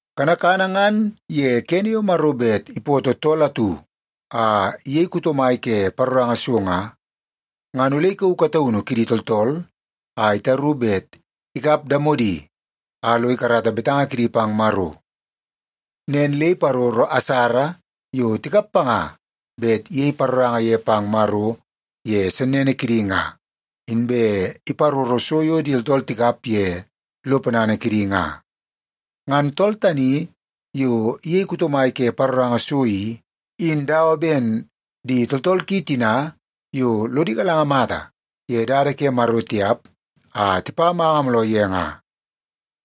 Kanakana ngan ye kene yo Maro bet ipootoo tool atu a iyei kuto mai ke paroranga so nga, ngan ole ikauu kataunu kidi tooltool a itaru bet ikap damodi a lo ikarata betanga kidi pang Maro. Nen le iparoro asara yo tikap panga bet iyei paroranga ye pang Maro ye sennene kidi nga, inbe iparoro so yo di tooltool tikap ye lo ponana kidi nga. Ngan tool tani yo iyei kuto mai ke paroranga so i, in dawa ben di tooltool ki tina yo lodi galanga mata ye dada ke Maro tiap a tipa manga mooloo ye nga.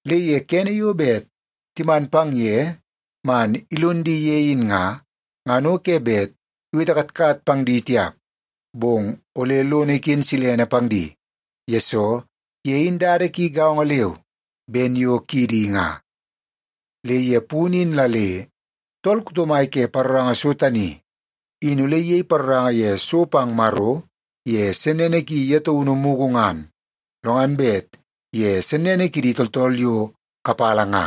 Le ye kene yo bet timan pang ye man ilon di ye in nga, ngan o ke bet iwete katkat pang di tiap, bong ole lono iken silene pang di, yesoo ye in dada ki gaongo leu ben yo kidi nga. Le ye punu in la le tool kuto mai ke paroranga so tani, in ole iyei paroranga ye so pang Maro ye sennene ki ye taunu mugu ngan, lo ngan bet ye sennene kidi tooltool yo kapala nga.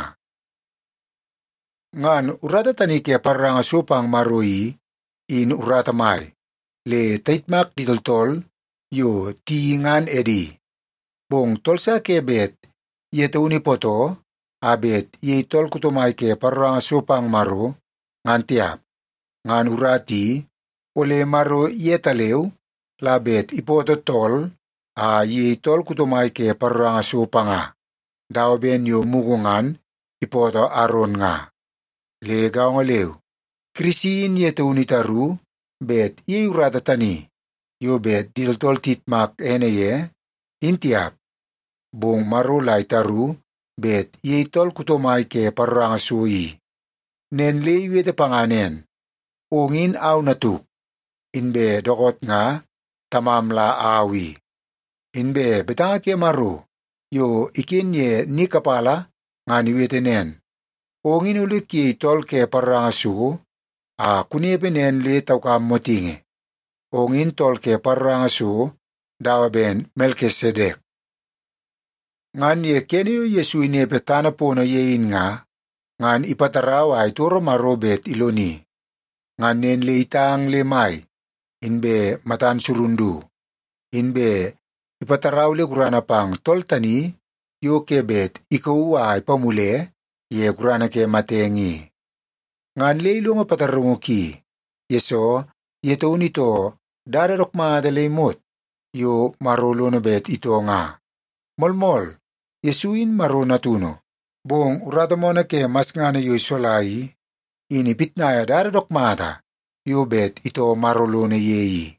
Ngan urata tani ke paroranga so pang Maro i, in urata mai, le tayitmak di tooltool yo tiyeii ngan edi. Bong tool sa ke bet ye taunu ipootoo a bet iyei tool kuto mai ke paroranga so pang Maro, ngan tiap. Ngan urata i, ole Maro yetaleu la bet ipootoo tool a iyei tool kuto mai ke paroranga so panga, dawa ben yo mugu ngan ipootoo Aron nga. Le gaongo leu, Kirisi in ye taunu itaru bet iyei urata tani yo bet di tooltool iyitmak ene ye, in tiap. Bong Maro la itaru bet iyei tool kuto mai ke paroranga so i. Nen le iwete panga nen, “Ong in au Natuk, inbe dookoot nga Tamam la au i.” Inbe betanga ke Maro yo iken ye ni kapala ngan iwete nen, “Ong in ole kuyei tool ke paroranga so a kunepe nen le taukam motingi. Ong in tool ke paroranga so dawa ben Melkisedek.” Ngan ye kene yo Yesu inepe tana pono ye in nga, ngan ipatarau a itoro Maro bet iloni. Ngan nen le itang le mai inbe matan surun du, inbe ipatarau le gurana pang tool tani yo ke bet ikauu a ipamule ye gurana ke matenge i. Ngan le ilongo pataraungu ki, yesoo ye taunu itoo dada dook mata le imot yo Maro lono bet itoo nga. Moolmool, Yesu in Maro Natunu, bong urata moonoo ke masngana yo isola i, in ipitnaia dada dook mata yo bet itoo Maro lono ye i.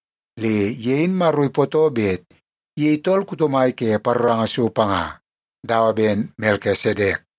Le ye in Maro ipootoo bet iyei tool kuto mai ke paroranga so panga, dawa ben Melkisedek.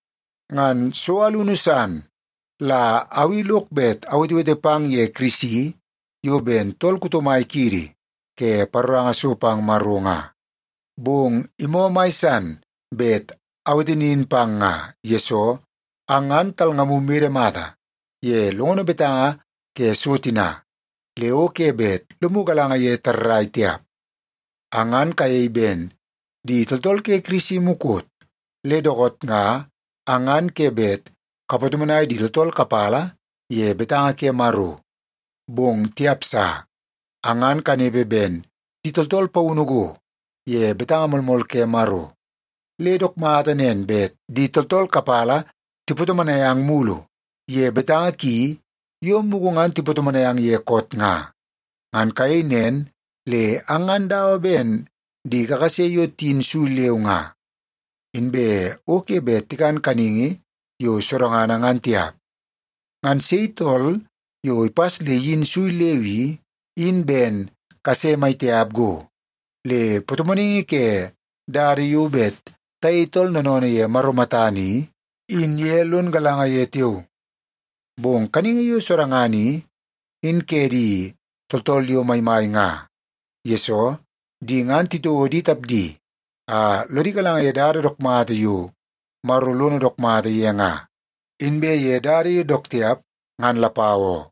Ngan so alunu san la au i lok bet awetewete pang ye Kirisi yo ben tool kuto mai kiidi ke paroranga so pang Maro nga. Bong imoo mai san bet awete nin pang nga, yesoo ang ngan talngamu mede mata ye longono betanga ke so tina, le o ke bet lomu galanga ye tarrai tiap. Ang ngan kayei ben di tooltool ke Kirisi mukot, le dookoot nga ang ngan ke bet kapatomonai di tooltool kapala ye betanga ke Maro. Bong tiap sa! Ang ngan kanepe ben di tooltool paunu go ye betanga moolmool ke Maro, le dook mata nen bet di tooltool kapala tipatomonai ang mulu ye betanga ki yo mugu ngan tipatomonai ang ye koot nga. Ngan kayei nen le ang ngan dawa ben di kakase yo tiyin sui leu nga, inbe o ke bet tikan kaningi yo sodangana ngan tiap. Ngan sei tool yo ipas le iyin sui leu i, in ben kase maitiap go. Le patomonaingi ke dada yo bet tayei tooltool noonoonoo ye Maro matana i, in ye lon galanga ye tiao. Bong kaningi yo sodangana i, in ke di tooltool yo maimai nga. Yesoo, di ngan titouo di tapdi a lodi galanga ye dada dook mata yo Maro lono dook mata ye nga, inbe ye dada yo dook tiap ngan lapau oo.